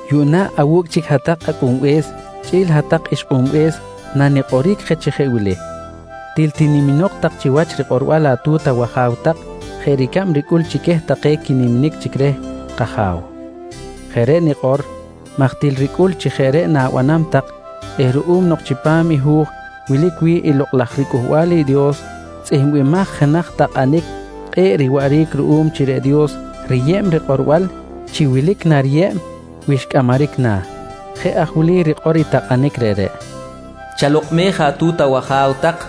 Yuꞌna awu̱cꞌ chic hat-tak acꞌunbe̱s chꞌi̱l hat-tak ixkꞌunbe̱s nanikꞌoric je chi jeꞌ wili: Til tiniminok tak chiwach i rikꞌorbal atu̱t awaja̱w tak jeꞌ ricab ricꞌul chi queh take quiniminic chic reh kAja̱w. Jeꞌ reꞌ nikꞌor maj til ricꞌul chi jeꞌ reꞌ na̱banam tak eh ruꞌum nok chipam Hu̱j wilic wi̱ꞌ i Lokꞌ laj riCꞌuhbal i Dios tzꞌihmbimaj jenaj takꞌanic kꞌe̱ꞌ riwaꞌric ruꞌum chi reꞌ Dios riyeb rikꞌorbal chi wilic nariyeb wi xcꞌamaric na̱. Jeꞌ aj wili rikꞌor i takꞌanic reꞌreꞌ: “Chalokꞌmej atu̱t awaja̱w tak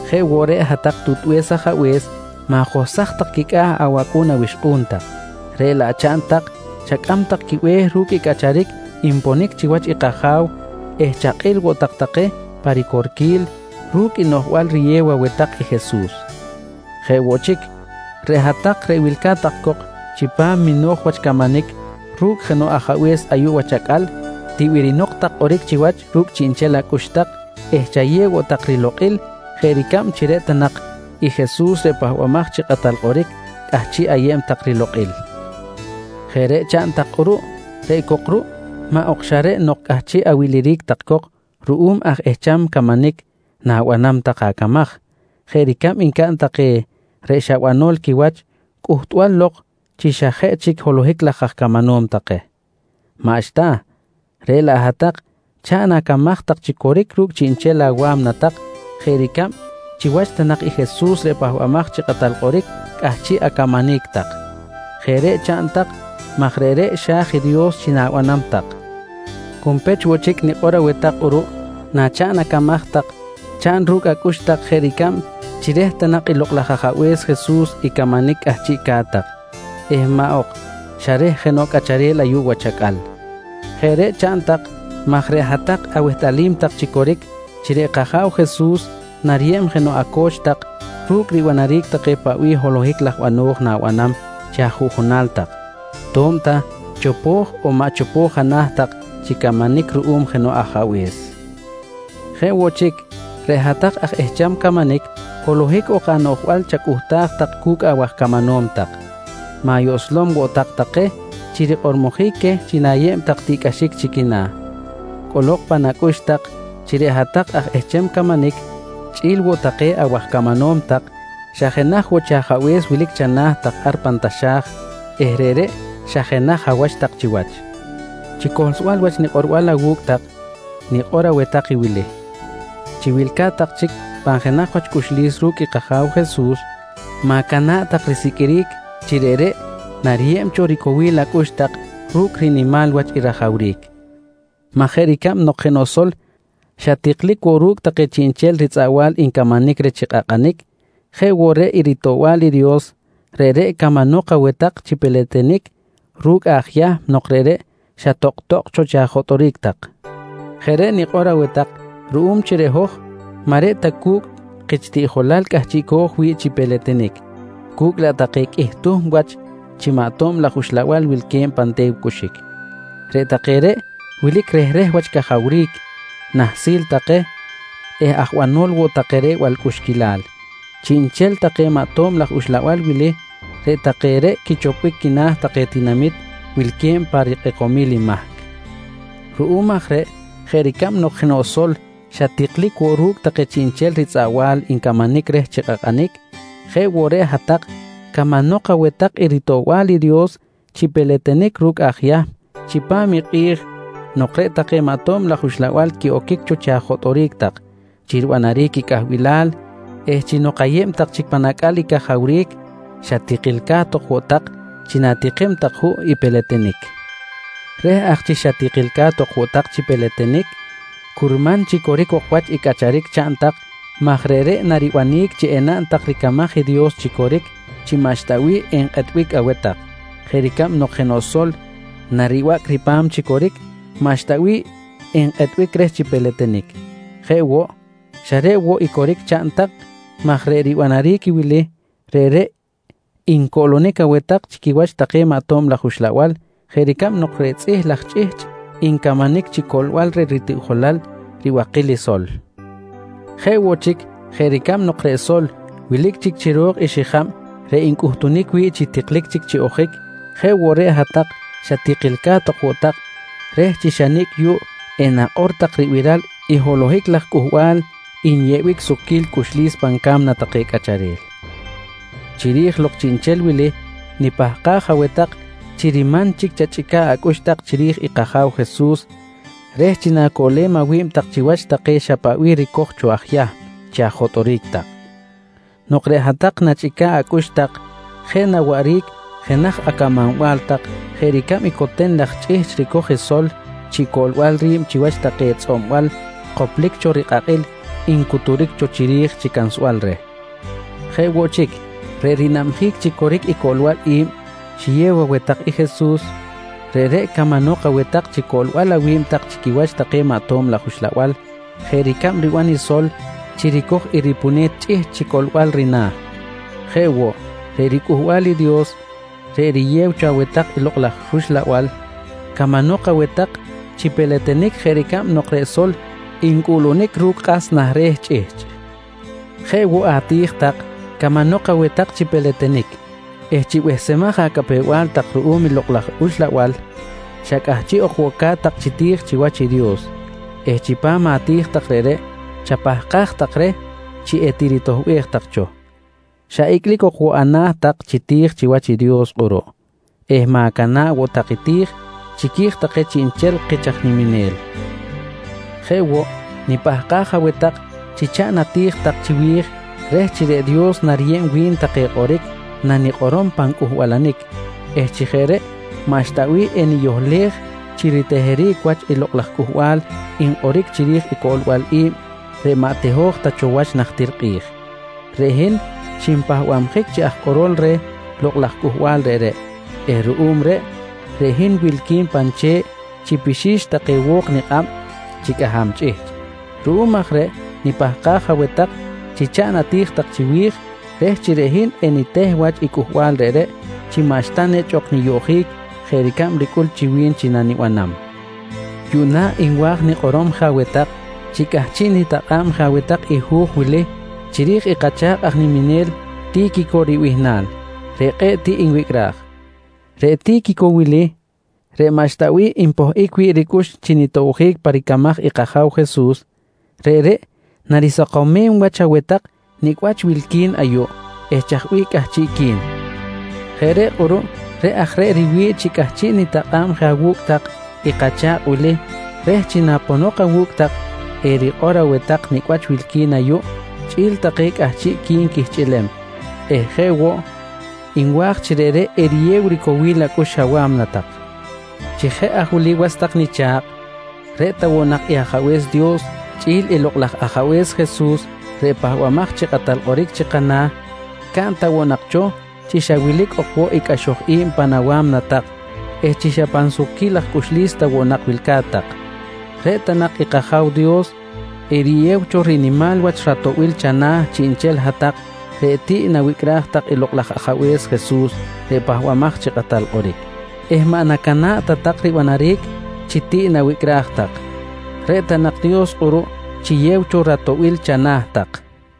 Jeꞌ woꞌ reꞌ hat-tak tutbe̱s ajabe̱s, ma̱johsaj tak quicꞌa̱ awacꞌu̱n awixkꞌu̱n tak, reꞌ laꞌ chaꞌn tak chacꞌam tak quibe̱h ru̱cꞌ i cꞌacharic nponic chiwach i kAja̱w eh chakꞌil woꞌ tak take pa ricorquil ru̱cꞌ i noꞌjbal riyew aweh tak i Jesus. Jeꞌ woꞌ chic, reꞌ hat-tak reꞌ wilca̱t tak cok chipam mino̱j wach camanic ru̱cꞌ jenoꞌ ajabe̱s ayuꞌ wach acꞌal, tibirinok tak kꞌoric chiwach ru̱cꞌ chiꞌnchel acꞌux tak eh chayew woꞌ tak rilokꞌil jeꞌ ricab chi reꞌ ta nak i Jesus reꞌ Pahbamaj chi Kꞌatal Kꞌoric, cꞌahchiꞌ ayeb tak rilokꞌil. Jeꞌ reꞌ chaꞌn tak kꞌuruꞌ reꞌ cok ruꞌ maꞌ ok xa reꞌ nok cꞌahchiꞌ awiliric tak cok ruꞌum aj ehcham camanic na̱banam tak acamaj jeꞌ ricab ncaꞌn take reꞌ xa banol quiwach cꞌuhtbal lok chi xa jeꞌ chic holohic laj aj camanom take. Maꞌxta, reꞌ laꞌ hat-tak chaꞌn acamaj tak chi coric ru̱cꞌ chiꞌnchel awa̱mna tak jeꞌ ricab chiwach ta nak i Jesus reꞌ Pahbamaj chi Kꞌatal Kꞌoric, cꞌahchiꞌ acamanic tak. Jeꞌ reꞌ chaꞌn tak maj reꞌreꞌ xa̱j i Dios chi na̱banam tak. Junpech woꞌ chic nikꞌor aweh tak kꞌuruꞌ nachaꞌn acamaj tak, chaꞌn ru̱cꞌ acꞌux tak jeꞌ ricab chi reh ta nak i Lokꞌ laj Ajabe̱s Jesus i camanic cꞌahchiꞌca̱t tak eh maꞌ ok xa reh jenoꞌ cꞌacharel ayuꞌ wach acꞌal. Jeꞌ reꞌ chaꞌn tak maj reꞌ hat-tak awehtꞌalim tak chi coric chi reꞌ kAja̱w Jesus nariyeb jenoꞌ aco̱ch tak ru̱cꞌ ribanaric take paꞌ bih holohic laj bano̱j na̱banam chi ajuꞌjunal tak to̱b ta chopo̱j on maꞌ chopo̱j ana̱ tak chi camanic ruꞌum jenoꞌ ajabe̱s. Jeꞌ woꞌ chic, reꞌ hat-tak aj ehcham camanic holohic ok noꞌjbal chacꞌuhtaj tak cu̱cꞌ awaj camanom tak. Ma̱yoꞌslom woꞌ tak take chi rikꞌormojic queh chi na̱yeb tak tiꞌcꞌaxic chi quina̱. Cꞌolok pan acꞌux tak chi reꞌ hat-tak aj ehcham camanic chꞌi̱l woꞌ take awaj camanom tak, xa jenaj woꞌ chi Ajabe̱s wilic chana̱ tak ar pan taxa̱j eh reꞌreꞌ xa jenaj awach tak chiwach. Chi cohlsbal wach nikꞌorbal awu̱cꞌ tak nikꞌor aweh tak wili: Chi wilca̱t tak chic pan jenaj wach cꞌuxlis ru̱cꞌ i kAja̱w Jesus, ma̱cana̱ꞌ tak risiqꞌuiric chi reꞌreꞌ nariyeb cho ricowil acꞌux tak ru̱cꞌ rinimal wach i rajawric maj jeꞌ ricab nok jenoꞌ sol xa tiklic woꞌ ru̱cꞌ take chiꞌnchel ritzꞌaꞌbal ncamanic reh chi kꞌakꞌanic jeꞌ woꞌ reꞌ i ritoꞌbal i Dios, reꞌreꞌ camanok aweh tak chi peletenic ru̱cꞌ aj Yahm nok reꞌreꞌ xa tokꞌ-tokꞌ cho chi ajotꞌoric tak. Jeꞌ reꞌ nikꞌor aweh tak ruꞌum chi reꞌ hoj maꞌ reꞌ ta cu̱cꞌ kich tiꞌjolal cꞌahchiꞌco̱j wi̱ꞌ chi peletenic, cu̱cꞌ laꞌ take qꞌuih tuhm wach chi maꞌ tob laj uxlabal wilque̱b pan te̱w cꞌuxic. Reꞌ take reꞌ wilic rehreh wach cajawric, nahsil take eh aj banol woꞌ take reh balcꞌuxquilal. Chiꞌnchel take maꞌ tob laj uxlabal wili, reꞌ take reꞌ quichopbic quina̱ take tinamit wilque̱b pa rikꞌekomil i mahc. Ruꞌum aj reꞌ jeꞌ ricab nok jenoꞌ sol xa tiklic woꞌ ru̱cꞌ take chiꞌnchel ritzꞌaꞌbal ncamanic reh chi kꞌakꞌanic, jeꞌ woꞌ reꞌ hat-tak camanok aweh tak i ritoꞌbal i Dios chi peletenic ru̱cꞌ aj Yahm chipam i kꞌi̱j nok reꞌ take maꞌ tob laj uxlabal quiꞌoquic cho chi ajotꞌoric tak chi ribanaric i cꞌahbilal eh chi nok ayeb tak chic pan acꞌal i cajawric, xa tikilca̱t ok woꞌ tak chi na̱tikim tak juꞌ peletenic. Reh aj chi xa tikilca̱t ok woꞌ tak chi peletenic, curman chi coric ok wach i cꞌacharic chaꞌn tak maj reꞌreꞌ naribanic chi enaꞌn tak ricamaj i Dios chi coric chi maꞌxta bih enkꞌetbic aweh tak jeꞌ ricab jenoꞌ sol naribacꞌ ripa̱m chi coric, maꞌxta bih enkꞌetbic reh chi peletenic. Jeꞌ woꞌ, xa reꞌ woꞌ i coric chaꞌn tak maj reꞌ ribanaric i wili, reꞌreꞌ ncoꞌlonic aweh tak chi quiwach take maꞌ tob laj uxlabal jeꞌ ricab nok reꞌ tzꞌih laj chꞌihchꞌ ncamanic chi coꞌlbal reh i ritiꞌjolal ribakil i sol. Jeꞌ woꞌ chic jeꞌ ricab nok reꞌ sol wilic chic chiro̱k i xijab reꞌ ncꞌutunic wi̱ꞌ chi tiklic chic chi ojic jeꞌ woꞌ reꞌ hat-tak xa tikilca̱t ok woꞌ tak reh chi xa nicꞌ yuꞌ enakꞌor tak ribiral i holohic laj cꞌuhbal nyeꞌbic sukquil cꞌuxlis pan ca̱mna take cꞌacharel. Chiri̱j lok chiꞌnchel wili, nipahkaj aweh tak chi riman chic chachꞌica̱ꞌ acꞌux tak chiri̱j i kAja̱w Jesus reh chi na̱coꞌlem awi̱b tak chiwach take xa paꞌ bih ricoj cho aj Yahm chi ajotꞌoric tak. Nok reꞌ hat-tak nachꞌica̱ꞌ acꞌux tak, jeꞌ na waꞌric jenaj acamanbal tak jeꞌ ricab i coten laj chꞌihchꞌ ricoj i sol chi coꞌlbal ri̱b chiwach take tzꞌob-bal koplic cho rikꞌakꞌil ncuturic cho chiri̱j chi cansbal reh. Jeꞌ woꞌ chic, reꞌ rinabjic chi coric i coꞌlbal i̱b xiyew aweh tak i Jesus, reꞌreꞌ camanok aweh tak chi coꞌlbal awi̱b tak chi quiwach take maꞌ tob laj uxlabal jeꞌ ricab riban i sol chi ricoj i ripune̱t chꞌihchꞌ chi coꞌlbal rina̱. Jeꞌ woꞌ, reꞌ riCꞌuhbal i Dios reꞌ riyew cho aweh tak i Lokꞌ laj rUxlabal camanok aweh tak chi peletenic jeꞌ ricab nok reꞌ sol ncꞌuꞌlunic ru̱cꞌ kꞌas nah re̱ chꞌihchꞌ. Jeꞌ woꞌ ati̱j tak camanok aweh tak chi peletenic eh chi behsemaj acapew-bal tak ruꞌum i Lokꞌ laj Uxlabal, xa cꞌahchiꞌ ok woꞌ ca̱t-tak chi ti̱j chiwach i Dios eh chipam ati̱j tak reꞌreꞌ chapahkaj tak reh chi etiritoꞌbej tak cho. Xa icꞌlic ok woꞌ ana̱ tak chi ti̱j chiwach i Dios kꞌuruꞌ eh ma̱cana̱ꞌ woꞌ tak ti̱j chiqui̱j take chiꞌnchel kich aj niminel. Jeꞌ woꞌ nipahkaj aweh tak chi chaꞌn ati̱j tak chiwi̱j reh chi reꞌ Dios nariyeb wi̱n take kꞌoric nanikꞌorom pan cꞌuhbalanic eh chi jeꞌ reꞌ maꞌxta bih eniyohlej chi riteheric wach i lokꞌ laj cꞌuhbal nkꞌoric chiri̱j i coꞌlbal i̱b reꞌ maꞌ teho̱j ta cho wach najtir kꞌi̱j. Reꞌ hin xinpahbabjic chi aj kꞌorol reh lokꞌ laj cꞌuhbal reꞌreꞌ eh ruꞌum reꞌ, reꞌ hin wilqui̱n pan che̱ꞌ chi pixi̱x take wo̱k nikꞌab chi cꞌaham chꞌihchꞌ. Ruꞌum aj reꞌ nipahkaj aweh tak chi chaꞌn ati̱j tak chiwi̱j reh chi reꞌ hin eniteh wach i cꞌuhbal reꞌreꞌ chi maꞌxta nechꞌ ok niyoꞌjic jeꞌ ricab ricꞌul chi wi̱n chi nanibanam. Yuꞌna nwa̱j nikꞌorom je aweh tak chi cꞌahchiꞌ nitakꞌa̱b je aweh tak i hu̱j wilic chiri̱j i kacha̱kꞌ aj niminel, Ti̱quico ribihnal reꞌ kꞌe̱ꞌ tiꞌ nwicꞌraj. Reꞌ Ti̱quico wili reꞌ maꞌxta bih npohꞌic wi̱ꞌ ricꞌux chi nitobjic pa ricamaj i kAja̱w Jesus, reꞌreꞌ narisakomem wach aweh tak nicꞌ wach wilqui̱n ayuꞌ eh chaj bih cꞌahchiꞌqui̱n. Jeꞌ reꞌ kꞌuruꞌ jeꞌ aj reꞌ riwi̱ꞌ chi cꞌahchiꞌ nitakꞌa̱b je awu̱cꞌ tak i kacha̱kꞌ wili reh chi naponok awu̱cꞌ tak erikꞌor aweh tak nicꞌ wach wilqui̱n ayuꞌ chꞌi̱l take cꞌahchiꞌqui̱n quihchꞌilem eh jeꞌ woꞌ nwa̱j chi reꞌreꞌ eriyew ricowil acꞌux awa̱mna tak. Chi jeꞌ aj wili was tak nicha̱kꞌ, reꞌ ta woꞌ nak i Ajabe̱s Dios chꞌi̱l i Lokꞌ laj Ajabe̱s Jesus reꞌ Pahbamaj chi Kꞌatal Kꞌoric chi kana̱ caꞌn ta woꞌ nak cho chi xa wilic ok woꞌ i cꞌaxoj i̱b pan awa̱mna tak eh chi xa pan sukquil laj cꞌuxlis ta woꞌ nak wilca̱t tak. Reꞌ ta nak i kAja̱w Dios eriyew cho rinimal wach ratoꞌbil chana̱ chiꞌnchel hat-tak reꞌ tiꞌ nawicꞌraj tak i Lokꞌ laj Ajabe̱s Jesus reꞌ Pahbamaj chi Kꞌatal Kꞌoric eh maꞌ nacana̱ꞌ ta tak ribanaric chi tiꞌ nawicꞌraj tak. Reꞌ ta nak Dios kꞌuruꞌ chiyew cho ratoꞌbil chana̱ tak.